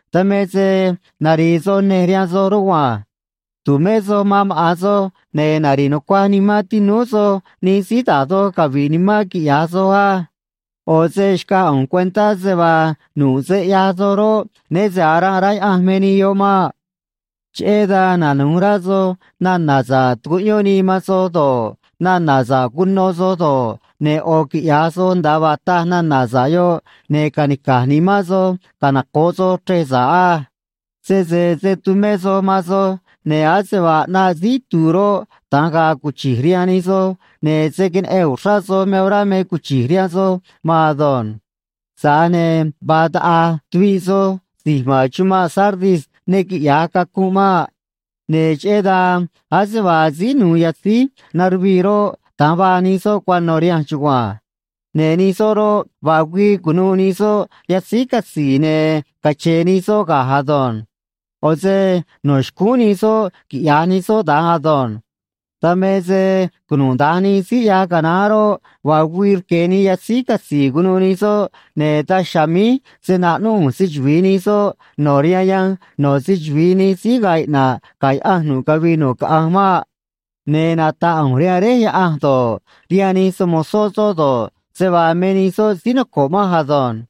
Dan me se nari̱i̱ soj nej rihaan soj rugua̱nj. Tu̱mé soj man maꞌa̱n soj, ne̱ nari̱ꞌ nucua̱j nimán tinúú soj nij síí da̱j doj cavi̱ꞌ nimán quiꞌya̱j soj á. ꞌO̱ se xcaj ꞌu̱nj cuentá se vaa nu̱ꞌ se ꞌyaj soj roꞌ, né se aranꞌ rá Yaꞌanj me nij yoꞌ maꞌ. ’Cheꞌé dan nanu̱j rá soj nana̱ sa̱ꞌ tucuꞌyón nii man soj do̱ꞌ, nana̱ sa̱ꞌ cuno soj do̱ꞌ, ne̱ ꞌo̱ quiꞌya̱j soj nda̱a vaa taj nana̱ sa̱ꞌ yoꞌ, ne̱ ca̱nica̱j nimán soj canoco̱ꞌ soj chrej sa̱ꞌ á. Sese se̱ tumé soj man soj, ne̱ ase vaa ꞌnaꞌ síí itu̱u̱ roꞌ, da̱nj ga̱a̱ cuchi̱j rihaan nij soj, ne̱ se̱ queneꞌen uxrá soj me orá me cuchi̱j rihaan soj maan ado̱nj. Tza̱j ne̱ vaa taꞌa̱j tuviꞌ soj si̱j ma̱n chumanꞌ Sardis ne quiꞌya̱j cacunꞌ maꞌ. Ne̱ cheꞌé dan ase vaa síí nu̱u̱ yatzíj naruvii roꞌ, da̱nj vaa nij soꞌ cuano̱ rihanj chugua̱nj. Ne̱ nij soꞌ roꞌ, vaa güii cu̱nuû nij soꞌ yatzíj catzi̱i̱, ne̱ cache̱e̱ nij soꞌ ga̱j ado̱nj. ꞌO̱ se no̱ xcúún nij soꞌ quiꞌya̱j nij soꞌ da̱nj ado̱nj. Dan me se cunuda̱nj nij síí ꞌyaj canaán roꞌ, vaa güii rque̱ nii yatzíj catzi̱i̱ cu̱nuû nij soꞌ, ne̱ daj chiha̱a̱ míj se̱ naꞌnúꞌ ꞌu̱nj se‑chuvi̱i nij soꞌ no̱ rihaan yanj no̱ se‑chuvi̱i nij síí ga̱a̱ iꞌna̱ꞌ ga̱ Yaꞌanj nu̱ꞌ cavii nu̱ꞌ caꞌanj maꞌ. Ne̱ nata̱ꞌ ꞌu̱nj rihaan Réj Yaꞌanj do̱ꞌ, rihaan nij se‑mo̱zó soꞌ do̱ꞌ, se vaa me nij soꞌ síí noco̱ꞌ manj ado̱nj.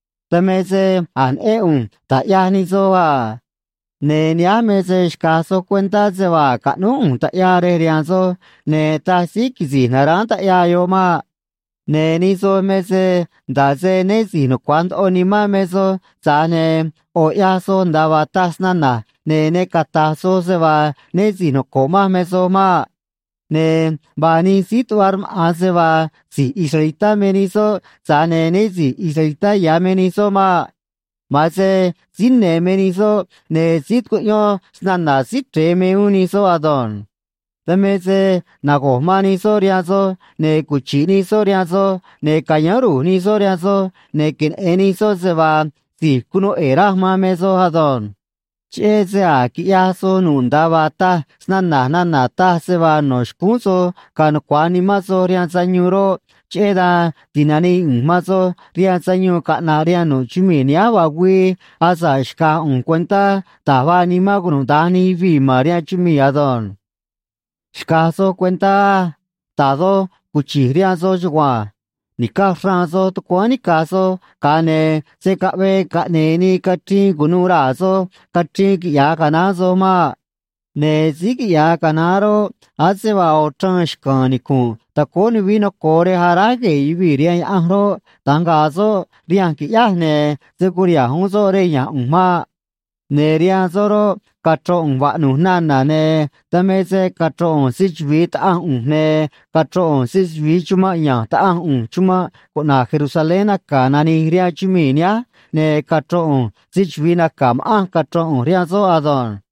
Dan me se a̱j neꞌén ꞌu̱nj da̱j ꞌyaj nij soj a. Ne̱ nihánj me se xca̱j soj cuentá se vaa a̱j caꞌnúj ꞌu̱nj taꞌyaa rej rihaan soj, ne̱ taj síí quisi̱j na̱ráán taꞌyaa yoꞌ maꞌ. Ne̱ nij soj me se nda̱ꞌ se né si̱j nucua̱j ndoꞌo nimán me soj, tza̱j ne̱ ꞌo̱ ꞌyaj soj nda̱a vaa taj snana̱j, ne̱ ne cata̱j soj se vaa né si̱j noco̱ꞌ manj me soj maꞌ. Ne̱ vaa nij síí tuꞌva rmaꞌa̱n se vaa si̱j israelitá me nij soꞌ, tza̱j ne̱ né si̱j israelitá ya̱ me nij soꞌ maꞌ. Ma̱an se síí ne̱ me nij soꞌ, ne̱ síí tucuꞌyón snana̱ Síí Chre̱e me uún nij soꞌ ado̱nj. Dan me se nago̱j man nij soꞌ rihaan soj, ne̱ cuchi̱ꞌ nij soꞌ rihaan soj, ne̱ ca̱yáán ru̱j nij soꞌ rihaan soj, ne̱ queneꞌe̱n nij soꞌ se vaa si̱j cunuu ꞌe̱e̱ raj man me soj ado̱nj. Cheꞌé se a̱j quiꞌyaj soj nu̱ꞌ nda̱a vaa taj snana̱j nana̱ taj se vaa no̱ xcúún soj ga̱a̱ nucua̱j nimán soj rihaan sayuun roꞌ, cheꞌé dan ti̱nanii ꞌu̱nj man soj rihaan sayuun caꞌna̱ꞌ rihaan nu̱ꞌ chumii̱ nihánj vaa güii, asa̱ꞌ xca̱j ꞌu̱nj cuentá da̱j vaa nimán cunuda̱nj nij yuvii̱ ma̱n rihaan chumii̱ ado̱nj. ’Xca̱j soj cuentá á. Da̱j doj cuchi̱j rihaan soj chugua̱nj. Ni̱caj xraan soj tucuáán nica̱j soj, ga̱a ne̱ se̱ caꞌvee caꞌne̱e̱ nii cachriin cu̱nuû raa̱ soj cachriin quiꞌyaj canaán soj maꞌ. Ne̱ síí quiꞌya̱j canaán roꞌ, ase vaa ꞌo̱ chraan xca̱a̱n nicu̱nꞌ tacóó nuvií noco̱o rej aráj gue̱e̱ yuvii̱ rihaan Yaꞌanj roꞌ, da̱nj ga̱a̱ soꞌ rihanj, qui̱ꞌyáj, ne̱ se̱ curiha̱nj uún soꞌ rej ya̱nj ꞌu̱nj maꞌ. Ne̱ rihaan soꞌ roꞌ, cachro̱n ꞌu̱nj vaꞌnu̱j nana̱, ne̱ dan me se cachro̱n ꞌu̱nj se‑chuvi̱i Taꞌanj ꞌu̱nj, ne̱ cachro̱n ꞌu̱nj se‑chuvi̱i chumanꞌ ya̱nj Taꞌanj ꞌu̱nj chumanꞌ cuꞌna̱j Jerusalén naca̱ nani̱j rihaan chumii̱ nihánj, ne̱ cachro̱n ꞌu̱nj se‑chuvi̱i naca̱ ma̱ꞌanj cachro̱n ꞌu̱nj rihaan soꞌ ado̱nj.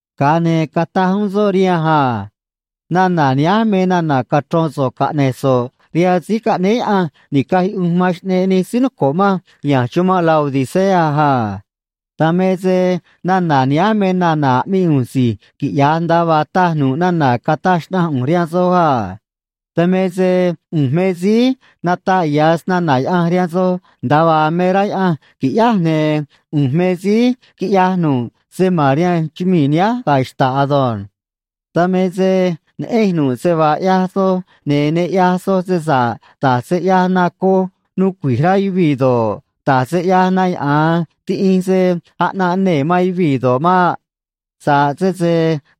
Ga̱a ne̱ cataj uún soꞌ rihanj a: ―Nana̱ nihánj me nana̱ cachro̱n so̱ꞌ caꞌne̱j so̱ꞌ rihaan síí caꞌnéé Yaꞌanj ni̱caj yuꞌunj man xꞌneꞌ nij síí noco̱ꞌ manj ya̱nj chumanꞌ Laodicea a: “Dan me se nana̱ nihánj me nana̱ aꞌmii ꞌu̱nj si̱j quiꞌya̱j nda̱a vaa taj nu̱ꞌ nana̱ cataj xnaꞌanj ꞌu̱nj rihaan soj a. Dan me se ꞌu̱nj me síí nataꞌ ya̱ snana̱ Yaꞌanj rihaan soj nda̱a vaa me rá Yaꞌanj qui̱ꞌyáj, ne̱ ꞌu̱nj me síí quiꞌyaj nu̱ꞌ se ma̱n rihaan chumii̱ nihánj ga̱ xta̱ꞌ ado̱nj. Dan me se neꞌenj nu̱ꞌ se vaa ꞌyaj soj, ne̱ ne ꞌyaj soj se sa̱ꞌ da̱j se ꞌyaj na coj nuu cui̱j rá yuvii̱ do̱ꞌ, da̱j se ꞌyaj na yaꞌa̱an tiꞌinj se aꞌnanꞌ nee̱ man yuvii̱ do̱ꞌ maꞌ. Sa̱ꞌ sese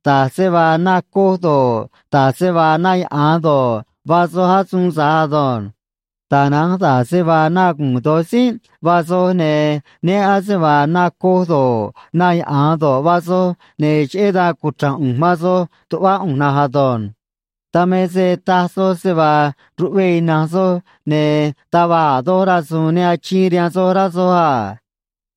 da̱j se vaa na coj do̱ꞌ, da̱j se vaa na yaꞌa̱an do̱ꞌ, vaa soj asuun tza̱j ado̱nj. Tana̱nj da̱j se vaa na gu̱u̱n do̱j tzínꞌ vaa soj, ne̱ né ase vaa na coj do̱ꞌ, na yaꞌa̱an do̱ꞌ, vaa soj, ne̱ cheꞌé dan cuchra̱nj ꞌu̱nj man soj tuꞌvá ꞌu̱nj na̱nj ado̱nj. Dan me se taj soj se vaa ruꞌve̱e̱ ina̱nj soj, ne̱ taj va̱j a̱ doj rasu̱u̱n ne achiin rihaan soj, rá soj a.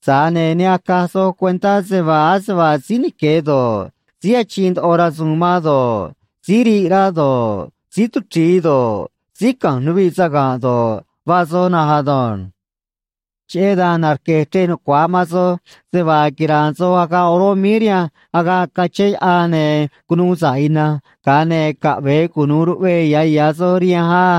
Tza̱j ne̱ ne acaj soj cuentá se vaa ase vaa síí nique̱ do̱ꞌ, síí achiin ndoꞌo rasu̱u̱n man do̱ꞌ, síí riꞌ rá do̱ꞌ, síí tuchri̱i do̱ꞌ, síí ca̱nj nuviꞌ saga̱nꞌ do̱ꞌ, vaa soj na̱nj ado̱nj. ’Cheꞌé dan narque̱j chrej nucua̱j man soj se vaa quira̱a̱n soj agaꞌ oró míí rihanj agaꞌ cachén yaꞌan ne̱ cunuu sa̱ꞌ ina̱nj, ga̱a ne̱ caꞌve̱e cunu̱u ruꞌve̱e̱ ya̱ ya̱ soj rihanj á.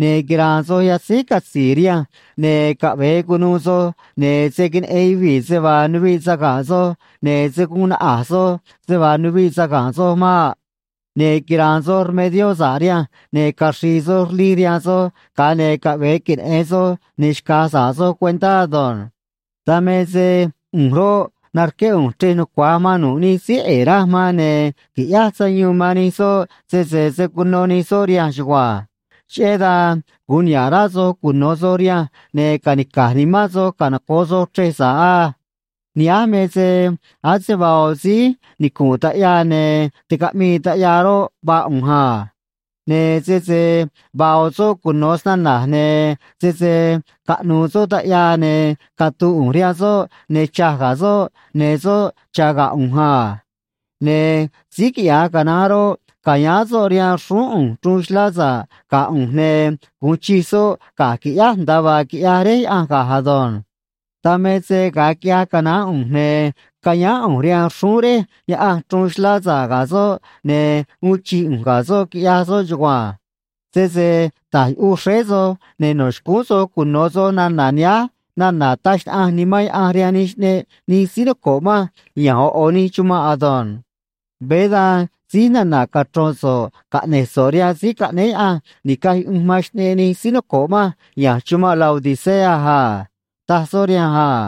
Ne̱ quira̱a̱n soj yatzíj catzi̱i̱ rihanj, ne̱ caꞌve̱e cu̱nuû soj, ne̱ se̱ queneꞌen yuvii̱ se vaa nuviꞌ saga̱nꞌ soj ne̱ se̱ guun naꞌa̱j soj se vaa nuviꞌ saga̱nꞌ soj maꞌ. Ne̱ quira̱a̱n soj rmedió sa̱ꞌ rihanj, ne̱ caxri̱i̱ soj rlij rihaan soj, ga̱a ne̱ caꞌve̱e queneꞌe̱n soj, ne̱ xca̱j sa̱ꞌ soj cuentá ado̱nj. Dan me se ꞌu̱nj roꞌ, narqué ꞌu̱nj chrej nucua̱j man nu̱ꞌ nij síí ꞌe̱e̱ raj man, ne̱ qui̱ꞌyáj sayuun man nij soꞌ sese se̱ cuno nij soꞌ rihanj chugua̱nj. Cheꞌé dan gu̱un niha̱ꞌ rá soj cuno̱ soj rihanj, ne̱ ca̱nica̱j nimán soj canoco̱ꞌ soj chrej sa̱ꞌ á. Nihánj me se ase vaa ꞌo̱ síí nicu̱nꞌ taꞌyaa ne̱ ticaꞌmii taꞌyaa roꞌ, vaa ꞌu̱nj a. Ne̱ sese vaa ꞌo̱ soꞌ cuno̱ snana̱j, ne̱ sese caꞌnu̱u̱ soꞌ taꞌyaa, ne̱ catu̱u̱ ꞌu̱nj rihaan soꞌ, ne̱ cha̱j ga̱ soꞌ, ne̱ soꞌ cha̱ ga̱ ꞌu̱nj a. Ne̱ síí quiꞌya̱j canaán roꞌ, ca̱yáán soꞌ rihaan xrúún ꞌu̱nj chruun xlá sa̱ꞌ ga̱ ꞌu̱nj, ne̱ gu̱un chij soꞌ ga̱j, qui̱ꞌyáj, nda̱a vaa quiꞌyaj Réj Yaꞌanj ga̱j ado̱nj. Dan me se ga̱a quiꞌyaj canaán ꞌu̱nj, ne̱ cayáán ꞌu̱nj rihaan xrúún Réj Yaꞌanj chruun xlá sa̱ꞌ ga̱ soꞌ, ne̱ uun chij ꞌu̱nj ga̱ soꞌ, quiꞌyaj soꞌ chugua̱nj. Sese ta̱j yuꞌuj xréé soj, ne̱ no̱ xcúún soj cuno̱ soj nana̱ nihánj nana̱ taj xnaꞌanj Nimán Yaꞌanj rihaan nij xꞌneꞌ nij síí noco̱ꞌ manj ya̱nj ꞌo̱ ꞌo̱ nij chumanꞌ ado̱nj.” Veé da̱nj síj nana̱ cachro̱n so̱ꞌ caꞌne̱j so̱ꞌ rihaan síí caꞌnéé Yaꞌanj ni̱caj yuꞌunj man xꞌneꞌ nij síí noco̱ꞌ manj ya̱nj chumanꞌ Laodicea a ―taj soꞌ rihanj a.